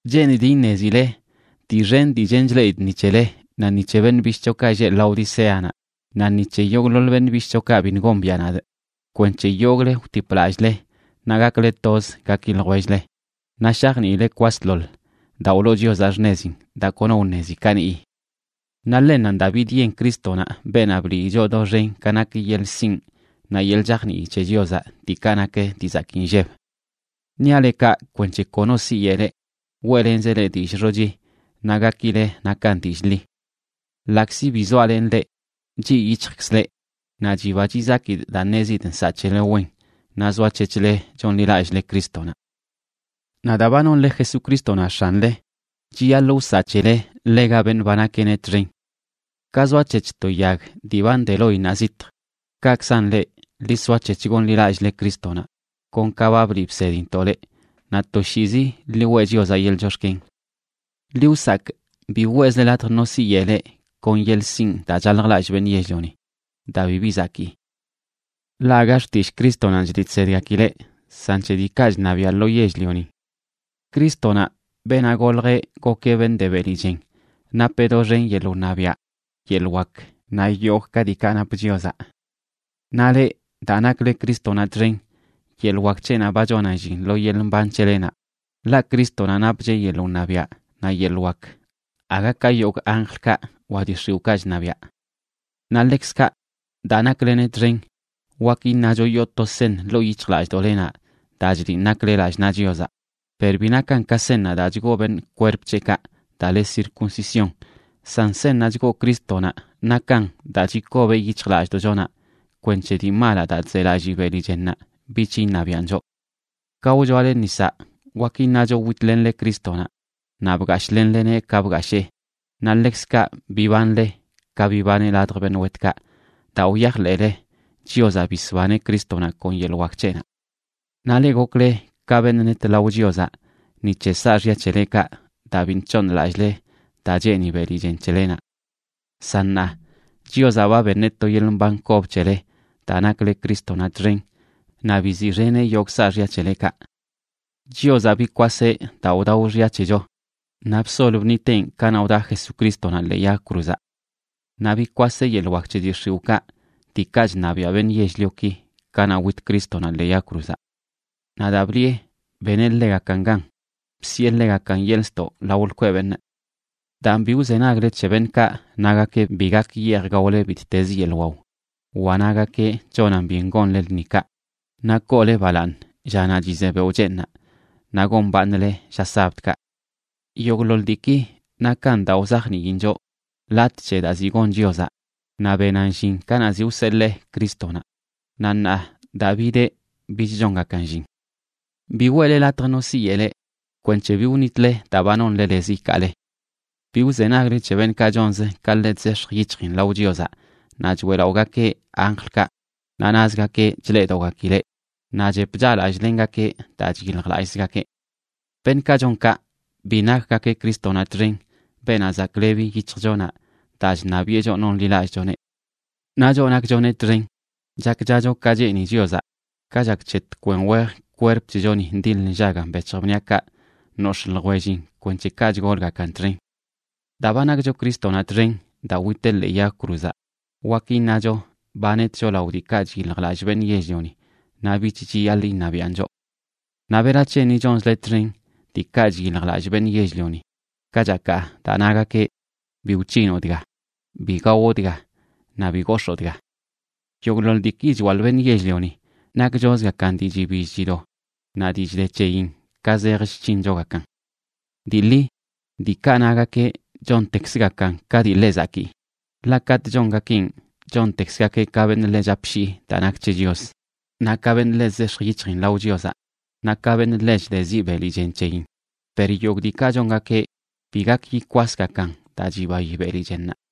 Cheenidꞌ iṉezileꞌ dii xen dii chen chleꞌidꞌ ni c̱hele naꞌ ni c̱he beṉꞌ bishꞌchokaꞌ lleꞌ Laodiceanaꞌ, naꞌ ni c̱he yogꞌḻoḻ beṉꞌ bishꞌchokaꞌ biṉꞌ gombiaꞌ nadꞌ, kwenc̱he yogꞌle wtipꞌ lallꞌle naꞌ gakle toz gaki ljwell-le, naꞌ shajniile kwasḻoḻ daa wloo Chiozaꞌ xṉezin daa kono wṉezi kaniꞌyi. Naꞌ ḻennanꞌ daa bidyen Crístonaꞌ, beenaꞌ blii choꞌ doxen ka nak yeḻꞌ sinꞌ naꞌ yeḻꞌ chajnii c̱he Chiozaꞌ, diikaꞌ nak dii zakii nlleb. Niaꞌ leꞌ kaꞌ kwenc̱he kono siyeꞌ leꞌ weꞌlenzeꞌ leꞌ dillꞌ xochi naꞌ gakile nakan dillꞌ ḻi. Ḻaꞌkzi bi zoalenꞌ leꞌ, chiꞌ yic̱hjkzꞌ leꞌ naꞌ chiba chizakidꞌ daa ṉezidꞌ nsaꞌ c̱hele wen naꞌ zoac̱hec̱hle chonḻilallꞌle Crístonaꞌ. Naꞌ daa ba nonle Jesucrístonaꞌ X̱anle, chiyaḻꞌ wsaꞌ c̱hele ḻega beṉꞌ ba nakeꞌneꞌ txen. Ka zoac̱hec̱h to yag dii ba nde loinnaꞌ zitj, kaꞌkzan leꞌ, ḻi soac̱hec̱h gonḻilallꞌle Crístonaꞌ, kon ka ba bliꞌ bsedintoꞌ leꞌ, naꞌ toshiizi ḻi weꞌ Chiozaꞌ yeḻꞌ chox̱ken. Ḻi wsakꞌ, bi weꞌzle latj no siyeꞌ leꞌ kon yeḻꞌ sinꞌ daa chaljlallꞌ beṉꞌ yell-lioni daa bibi zakii. Ḻaꞌ aga xtillꞌ Crístonanꞌ chliꞌ chsedgakileꞌ san c̱he diikaꞌ chṉabiaꞌ lo yell-lionin. Crístonaꞌ, beenaꞌ goljeꞌ gokeꞌ beṉꞌ de beli chen, napeꞌ doxen yeḻꞌ wṉabiaꞌ, yeḻꞌ wak naꞌ yogꞌ ka diikaꞌ nap Chiozaꞌ. Naꞌ leꞌ, daa nakle Crístonaꞌ txen, yeḻꞌ wak c̱heꞌnaꞌ ba chonan llin lo yeḻꞌ mban c̱helenaꞌ, ḻaꞌ Crístonaꞌ napcheꞌ yeḻꞌ wṉabiaꞌ naꞌ yeḻꞌ wak aga ka yogꞌ anjlkaꞌ wa dii x̱iwꞌkaꞌ chṉabiaꞌ. Naꞌ ḻekzkaꞌ daa nakleneꞌ txen wak iṉacho yoo to seṉ ḻoo yic̱hjlallꞌdoꞌlenaꞌ daa chliꞌn nakle lallꞌ naꞌ Chiozaꞌ, per bi nakan ka seṉnaꞌ daa chgoo beṉꞌ kwerp c̱heꞌkaꞌ daa le circuncisión, san seṉnaꞌ chgoo Crístonaꞌ nakan daa chikobeꞌ yic̱hjlallꞌdoꞌchonaꞌ kwenc̱he dii malaꞌ daa chzelallii beli chennaꞌ bich iṉabiaꞌn choꞌ. Ka wchoale nisaꞌ wak iṉacho witlenle Crístonaꞌ, naꞌ bgashꞌlenleneꞌ ka bgashee, naꞌ ḻekzkaꞌ bibanle ka bibaneꞌ ladj beṉꞌ wetkaꞌ daa wyajḻeꞌle Chiozaꞌ bisbaneꞌ Crístonaꞌ kon yeḻꞌ wak c̱heꞌnaꞌ. Naꞌ leꞌ, gokle ka beṉꞌ net lao Chiozaꞌ ni c̱he saaxya c̱helekaꞌ daa biṉꞌ c̱hooṉlallꞌle daa cheeni beli chen c̱helenaꞌ. San ṉaa, Chiozaꞌ ba beṉeꞌ to yeḻꞌ mban kob c̱hele daa nakle Crístonaꞌ txen, naꞌ biziꞌxeneꞌ yogꞌ saaxya c̱helekaꞌ. Chiozaꞌ bikwaseꞌ daa wdao xya c̱hecho, naꞌ bsol bṉiteꞌn kanaꞌ wdaꞌ Jesucrístonaꞌ ḻee yag cruzaꞌ. Naꞌ bikwaseꞌ yeḻꞌ wak c̱he dii x̱iwꞌkaꞌ, diikaꞌ chṉabiaꞌ beṉꞌ yell-lioki, kanaꞌ wit Crístonaꞌ ḻee yag cruzaꞌ. Naꞌ daa bliꞌe beneꞌ ḻegakan gan, bsiꞌe ḻegakan yeḻꞌ ztoꞌ lao lkweꞌ beṉꞌ. Daan, bi wzenagle c̱he beṉꞌkaꞌ nagakeꞌ bi gak yeej gaole bittez yeḻꞌ wao, wa nagakeꞌ chonan byen gonle lṉikaꞌ, naꞌ koole balaaṉ llanaꞌ chize beoꞌ cheeṉaꞌ, naꞌ gombaaṉle lla sabdkaꞌ. Yogꞌḻoḻ diiki nakan daa wzajniin choꞌ latꞌ c̱he daa ziꞌ gon Chiozaꞌ naꞌ benan llin kanaꞌ ziꞌ wseḻee Crístonaꞌ, naꞌ ṉaa daa bideꞌ bich chongakan llin. Bi weꞌle latj no siyeꞌ leꞌ kwenc̱he bi wṉitle daa ba nonle lez ikaale. Bi wzenagle c̱he beṉꞌkaꞌ chonzə ka ḻe chzex̱j yic̱hjin lao Chiozaꞌ, naꞌ choeꞌlaꞌogakeꞌ anjlkaꞌ, naꞌ nazgakeꞌ chleꞌdogakileꞌ naꞌ chep chaꞌlallꞌlengakeꞌ daa chyiljlallꞌzgakeꞌ. Beṉꞌkaꞌ chon kaꞌ bi nakgakeꞌ Crístonaꞌ txen, beenaꞌ zaklebi yic̱hjchonaꞌ daa chṉabiꞌe choꞌ nonḻilallꞌchoneꞌ. Naꞌ choꞌ nakchoneꞌ txen, chakchacho ka cheeni Chiozaꞌ, ka chak c̱he tkwen wej kwerp c̱hechoni ndiḻ nllagan bec̱hj bniaꞌkaꞌ nox̱ꞌ ljwellin kwenc̱he kaꞌ chgolgakan txen. Daa ba nakcho Crístonaꞌ txen daa witeꞌ ḻee yag cruzaꞌ, wak iṉacho ba netcho lao diikaꞌ chyiljlallꞌ beṉꞌ yell-lioni naꞌ bich chiyaḻꞌ iṉabiaꞌn choꞌ. Naꞌ ¿berac̱he ni chonzle txen diikaꞌ chyiljlallꞌ beṉꞌ yell-lioni, kachakaꞌ daa nagakeꞌ: “Bi wc̱hinoꞌ dga, bi gawoꞌ dga, naꞌ bi gox̱oo dga”? Yogꞌḻoḻ diiki chwaḻꞌ beṉꞌ yell-lioni nakchozgakan dii chibill chido naꞌ dii chde c̱heyin ka zej chc̱hinchogakan. Dii ḻi, diikaꞌ nagakeꞌ chontekzgakan ka dii ḻe zakii, ḻaꞌ katꞌ chongakeꞌn chontekzgakeꞌ ka beṉꞌ ḻe chapshii daa nak c̱he Chios, naꞌ ka beṉꞌ ḻe chzex̱j yic̱hjin lao Chiozaꞌ, naꞌ ka beṉꞌ ḻe chdeziꞌ beli chen c̱heyin, per yogꞌ diikaꞌ chongakeꞌ bi gak yikwasgakan daa chibayi beli chennaꞌ.